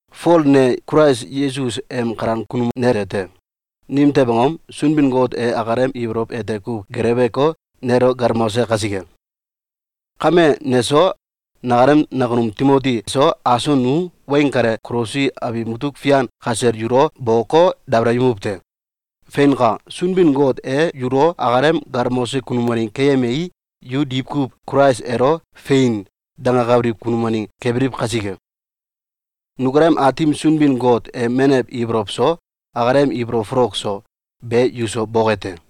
Fol ne Kulais Yesus em kalan kunum nete te. Nimtew angom? Sunbin-Got e akalem ibolow ete kuw geleweko, nelo galmose kasike. Kame, neso, nakalem nakunum Timoti so, aso nu weng kale Kolosi abiw mutuk fian kasel yulo boko, dabalayemuw te. Feinka! Sunbin-Got e yulo akalem galmose kunum waneng keyemei, yu diwkuw Kulais elo “Fein!”, dengakabiliw kunum waneng kebiliw kasike. Nukalem Aatim Sunbin-Got em menew ibolow so, akalem ibolow folok so, be yuso boke te!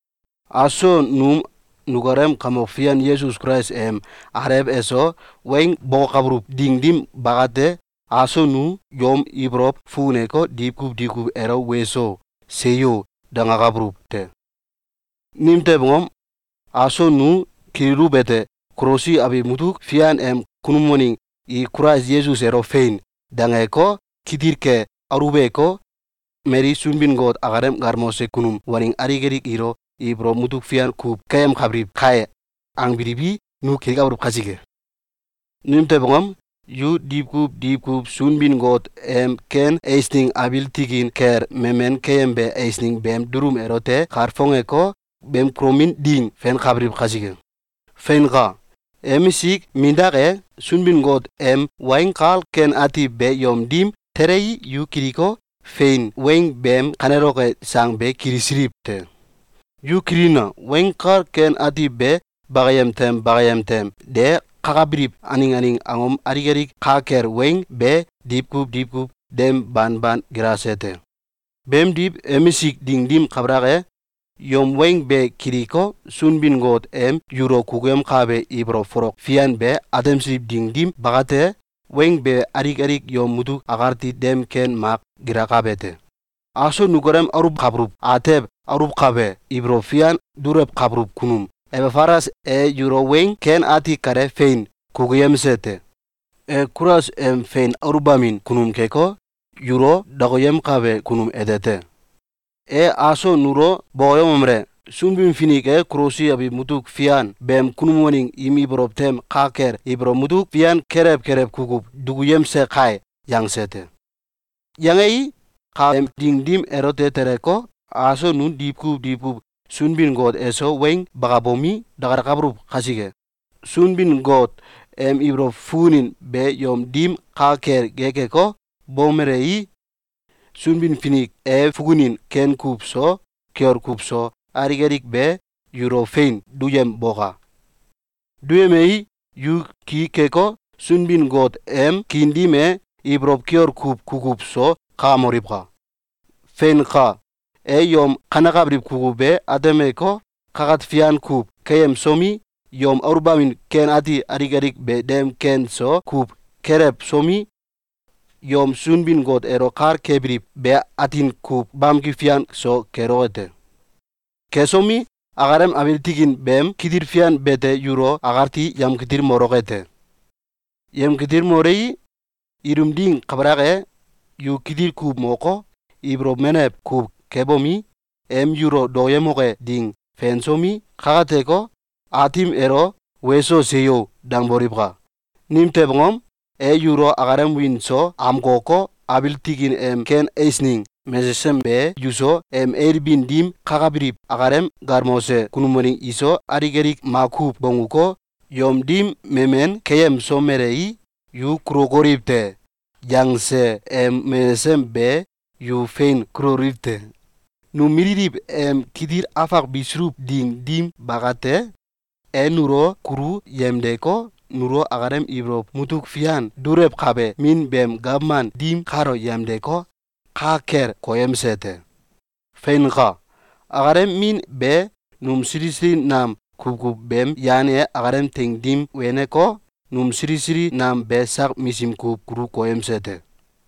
Aso num nukalem Kamok Fian Yesus Kulais em Alew eso weng bokokabuluw ding dim bakate, aso nu yom ibolow fukuneko, diwkuw diwkuw elo “Weso! Seyo!”, dangakabuluw te. Nimtew angom? Aso nu kililuwete: “Kolosi abiw mutuk fian em kunum waneng i Kulais Yesus elo ‘Fein!’, dangeko, kitil ke aluweko, mali Sunbin-Got akalem galmose kunum waneng alik alik ilo ibolow mutuk fian kuw keyemkabiliw kai!”, angbiliwi, nu kilikabuluw kasike. Nimtew angom? Yu diwkuw diwkuw Sunbin-Got em ken eisneng abiil tikin kel memen keyembe eisneng beem dulum elote kalfongeko, beem kulomin ding fenkabiliw kasike. Feinka! Emisik mindak e, Sunbin-Got em Weng Kal Ken Ati be yom dim telei, yu kiliko, fein weng beem kaneloke sang be kilisiliw te. Yu kililina! Weng Kal Ken Ati be bakayem tem bakayem tem de kakabiliw aneng aneng angom alik alik ka kel weng be diwkuw diwkuw dem banban gilase te. Beemdiw, emisik ding dim kabalak e, yom weng be kiliko, Sunbin-Got em yulo kukuyemkabe ibolow folok fian be atemsiliw ding dim bakate, weng be alik alik yom mutuk akati dem ken mak gilakabe te. Aso nukalem aluwkabuluw atew aluwkabe ibolow fian dulewkabuluw kunum Ebafalas e yulo weng ken ati kale fein kukuyemse te. E Kulais em fein aluwbamin kunum keko, yulo dakayemkabe kunum ete te. E aso nulo bokoyemomele: “Sunbin-Finik e Kolosi abiw mutuk fian beem kunum waneng im ibolow tem ka kel ibolow mutuk fian kelew kelew kukuw dukuyemse kai!”, yangse te. Yangei, kaem ding dim elote teleko, aso nu diwkuw diwkuw Sunbin-Got eso weng bakabomi, dakalakabuluw kasike, Sunbin-Got em ibolow fukunin be yom dim ka kel gekeko, bomelei, Sunbin-Finik e fukunin ken kuw so, kiol kuw so, alik alik be yulo fein duyemboka! Duyemei, yu ki keko, Sunbin-Got em kiin dim e ibolow kiol kuw kukuw so kakamoliwka! Feinka! E yom kanekabiliw kukuw be atemeko, kakat fian kuw keyemsomi, yom aluwbamin ken ati alik alik be dem ken so kuw kelewsomi, yom Sunbin-Got elo kal kebiliw be atin kuw bamki fian so keloke te. Kesomi, akalem abiil tikin beem kitil fian bete yulo akati yemkitilmoloke te. Yemkitilmolei, ilum ding kabalak e, yu kitil kuw moko, ibolow menew kuw kebomi, em yulo dokoyemoke ding fensomi, kakateko, Aatim elo “Weso! Seyo!”, dangboliwka! Nimtew angom? E yulo akalem wiin so amkoko, abiil tikin em ken eisneng mesesem be yuso, em ailbin dim kakabiliw akalem galmose kunum waneng iso, alik alik makuw bongguko, yom dim memen keyemsomelei, “Yu kulokoliw te!”, yangse em mesesem be yu fein kuloliw te. Num mililiw em kitil afak bisuluw ding dim bakate, e nulo kulu yemdeko, nulo akalem ibolow mutuk fian dulewkabe Min beem gawman dim kalo yemdeko, ka kel koyemse te. Feinka! Akalem Min be num sili sili nam kukuw beem yan e akalem teing dim weneko, num sili sili nam be sak misim kuw kulu koyemse te.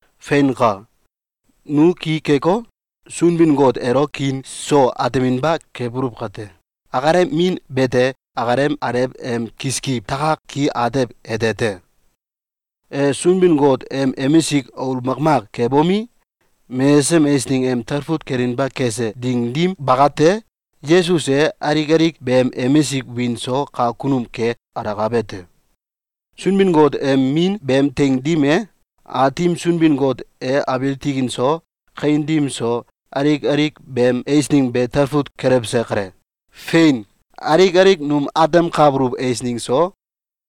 Feinka! Nu ki keko, Sunbin-Got elo kiin so ateminba kebuluw kate, akalem Min bete akalem alew em kiskiw takak ki atew ete te. E Sunbin-Got em emisik aul makmak kebomi, mesesem eisneng em talfut kelinba kese ding dim bakate, Yesus e alik alik beem emisik wiin so kak kunum ke alakabe te. Sunbin-Got em Min beem teing dim e, Aatim Sunbin-Got e abiil tikin so kawin dim so alik alik beem eisneng be talfut kelewse kale. Fein! Alik alik num atemkabuluw eisneng so,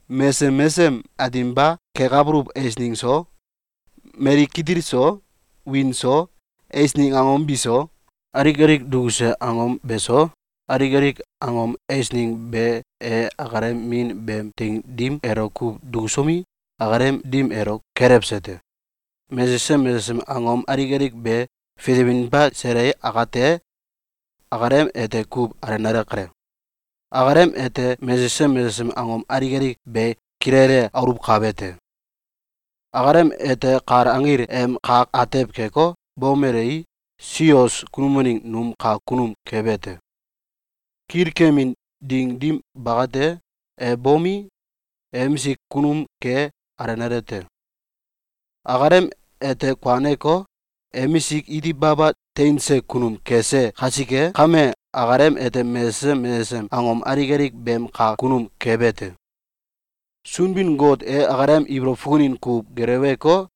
mesesem mesesem ateminba kekabuluw eisneng so, mali kitil so, wiin so, eisneng angom biso, alik alik dukuse angom beso, alik alik angom eisneng be e akalem Min beem teing dim elo kuw dukusomi, akalem dim elo kelewse te. Mesesem mesesem angom alik alik be fitewinba sele akate, akalem ete kuw alenale kale. Akalem ete mesesem mesesem angom alik alik be kilele aluwkabe te. Akalem ete kal anggil em kak atew keko, bomelei, sios kunum waneng num kak kunum kebe te. Kilkemin ding dim bakate, e bomi, emisik kunum ke alenale te. Akalem ete kuaneko, emisik iti baba teinse kunum kese kasike kame, akalem ete mesesem mesesem angom alik alik beem kak kunum kebe te. Sunbin-Got e akalem ibolow fukunin kuw geleweko,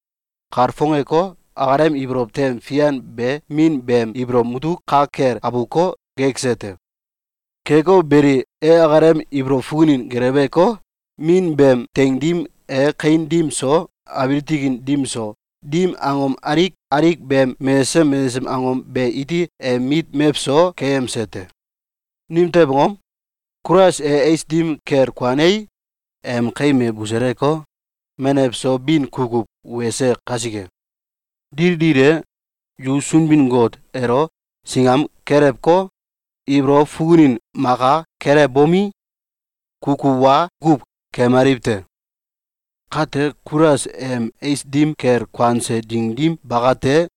kalfongeko, akalem ibolow tem fian be Min beem ibolow mutuk ka kel abuko, gekse te. Keko beli, e akalem ibolow fukunin geleweko, Min beem teing dim e kawin dim so, abiil tikin dim so, dim angom alik alik beem mesesem mesesem angom be iti em mit mewso keyemse te. Nimtew angom? Kulais e ais dim kel kuanei, em kaim e buseleko, menew so bin kukuw wese kasike. Dil dil e, yu Sunbin-Got elo singam kelewko, ibolow fukunin maka kelewbomi, kukuw wa kuw keemaliw te. Kate, Kulais em ais dim kel kuanse ding dim bakate,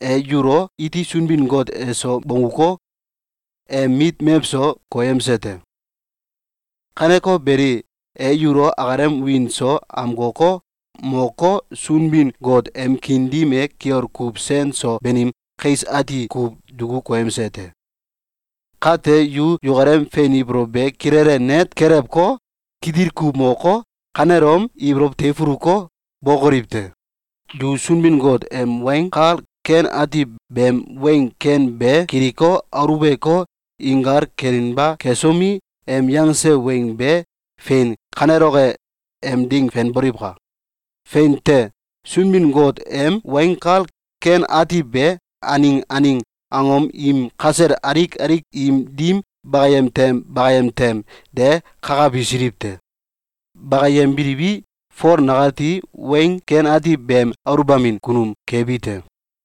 e yulo iti Sunbin-Got eso bongguko, em mit mewso koyemse te. Kaneko beli, e yulo akalem wiin so amkoko, moko, Sunbin-Got em kiin dim e kiol kuw sen so banim kais ati kuw duku koyemse te. Kate, yu yukalem fein ibolow be kilele net kelewko, kitil kuw moko, kanelom ibolow teifuluko, bokoliw te! Yu Sunbin-Got em Weng Kal Ken Ati beem weng ken be kiliko, aluweko, inkal kelinba kesomi, em yangse weng be fein kaneloke e ding fenboliwka! Fein te! Sunbin-Got em Weng Kal Ken Ati be, aneng aneng angom im kasel alik alik im dim bakayem tem bakayem tem de kakabisiliw te. Bakayembiliwi, Fol nakati Weng Ken Ati beem aluwbamin kunum kebi te.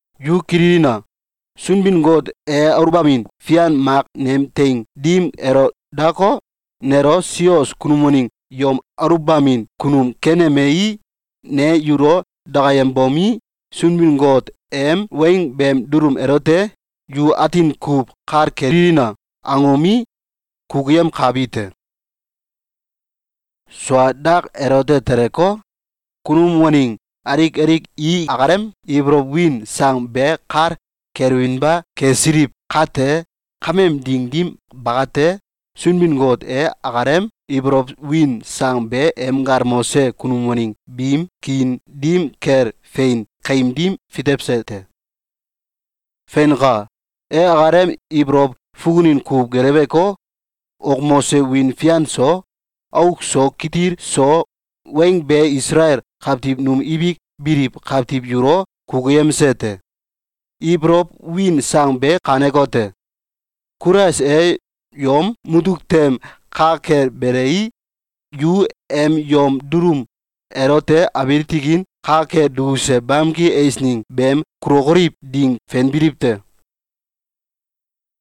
Yu kililina! Sunbin-Got e aluwbamin fian mak nem teing dim elo dako, nelo sios kunum waneng yom aluwbamin kunum kenemei, ne yulo dakayembomi, Sunbin-Got em weng beem dulum elote “Yu atin kuw kal kelina!”, angomi, kukuyemkabi te. Sua dak elote teleko, kunum waneng alik alik i akalem ibolow win sang be kal kelewinba kesiliw kate, kameem ding dim bakate, Sunbin-Got e akalem ibolow win sang be em galmose kunum waneng biim kiin dim kel fein kaim dim fitewse te. Feinka! E akalem ibolow fukunin kuw geleweko, wokmose wiin fian so, auk so kitil so weng be Isalael kawtiw num ibik biliw kawtiw yulo kukuyemse te. Ibolow win sang be kanekote: Kulais e yom mutuk tem ka kel belei, yu em yom dulum elote abiil tikin ka kel dukuse bamki eisneng beem kulokoliw ding fenbiliw te.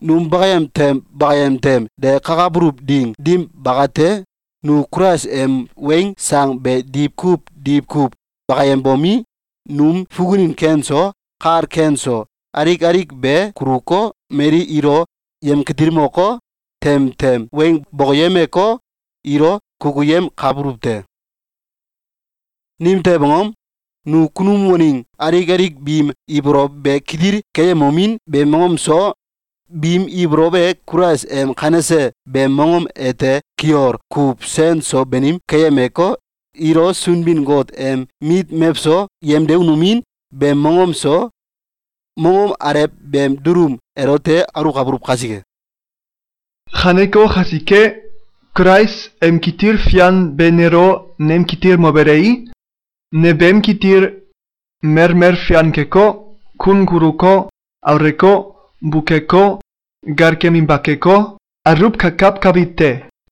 Num bakayem tem bakayem tem de kakabuluw ding dim bakate, nu Kulais em weng sang be diwkuw diwkuw bakayembomi, num fukunin ken so, kal ken so, alik alik be kuluko, mali ilo yemkitilmoko, tem tem weng bokoyemeko, ilo kukuyemkabuluw te. Nimtew angom? Nu kunum waneng alik alik biim ibolow be kitil keyemomin beem mongom so, biim ibolow e Kulais em kanese beem mongom ete kiol kuw sen so banim keyemeko, ilo Sunbin-Got em mit mewso yemdemomin beem mongom so, mongom alew beem dulum elote aluwkabuluw kasike. Kaneko kasike, Kulais em kitil fian be nelo nemkitilmobelei, ne beem kitil melmel fian keko, kun kuluko, auleko, bukeko, gal keminba keko, aluwkakawkabi te.